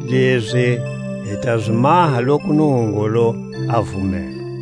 Lezi hi ta zi maha loku Nungungulu a vumela.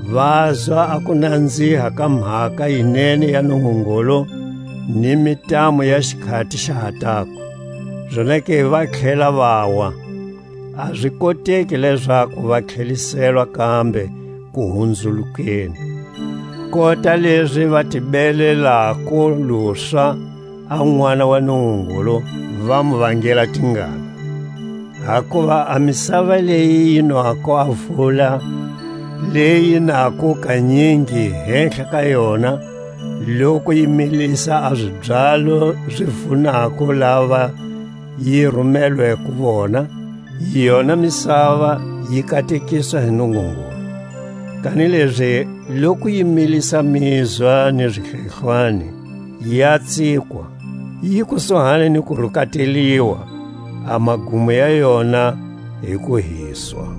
vazwa a kunanziha ka mhaka yi nene ya Nungungulu, ni mintamu ya xikhati xa ha tako, zonake va tlhela vawa, a zi koteki lezaku va tlheliselwa kambe kuhunzulukeni, kota lezi va ti belelako luswa a Nʼwana wa Nungungulu, va mu vangela tingana. Hakuva a misava leyi yi nwako a vula leyi yi nako kanyingi hehla ka yona, loku yi milisa a zibyalo zi vunako lava yi rimelweko vona, yona misava yi katekiswa hi Nungungulu. Kanilezi loku yi milisa mizwa ni zihlehlwani, ya tsikwa, yi kusuhani ni ku rukateliwa, a magumo ya yona hi ku hiswa.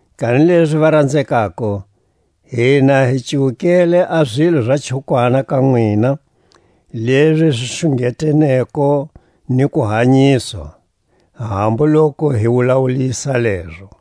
Kanilezi, varanzekako, hina hi cuwukele a zilo za chukwana ka nwina, lezi zi xungeteneko ni kuhanyiswa, hambu loku hi wulawulisa lezo.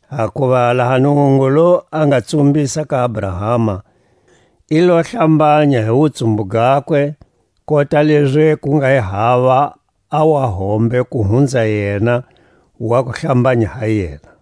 Hakuva laha Nungungulu a nga tsumbisa ka Abrahama, i lo hlambanya hi wutsumbu gakwe, kota lezi ku nga hi hava a wahombe ku hunza yena wa ku hlambanya ha yena.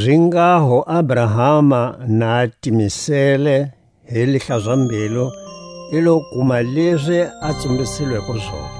Zinghaho Abrahama na a timisele hi lihlaza-mbilu, i lo kuma lezi a tsumbisilweko zona.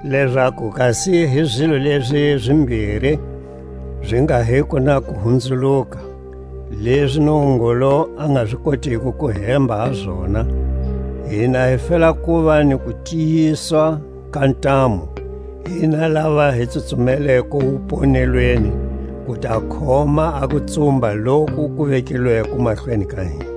lezaku kasi hi zilo lezi zimbiri zi nga hiko na kuhunzuluka, lezi Nungungulu a nga zi kotiko ku hemba ha zona, hina hi fela kuva ni kutiyiswa ka ntamu, hina lava hi tsutsumeleko wuponelweni ku ta khoma a kutsumba loku ku vekilweko mahlweni ka hina.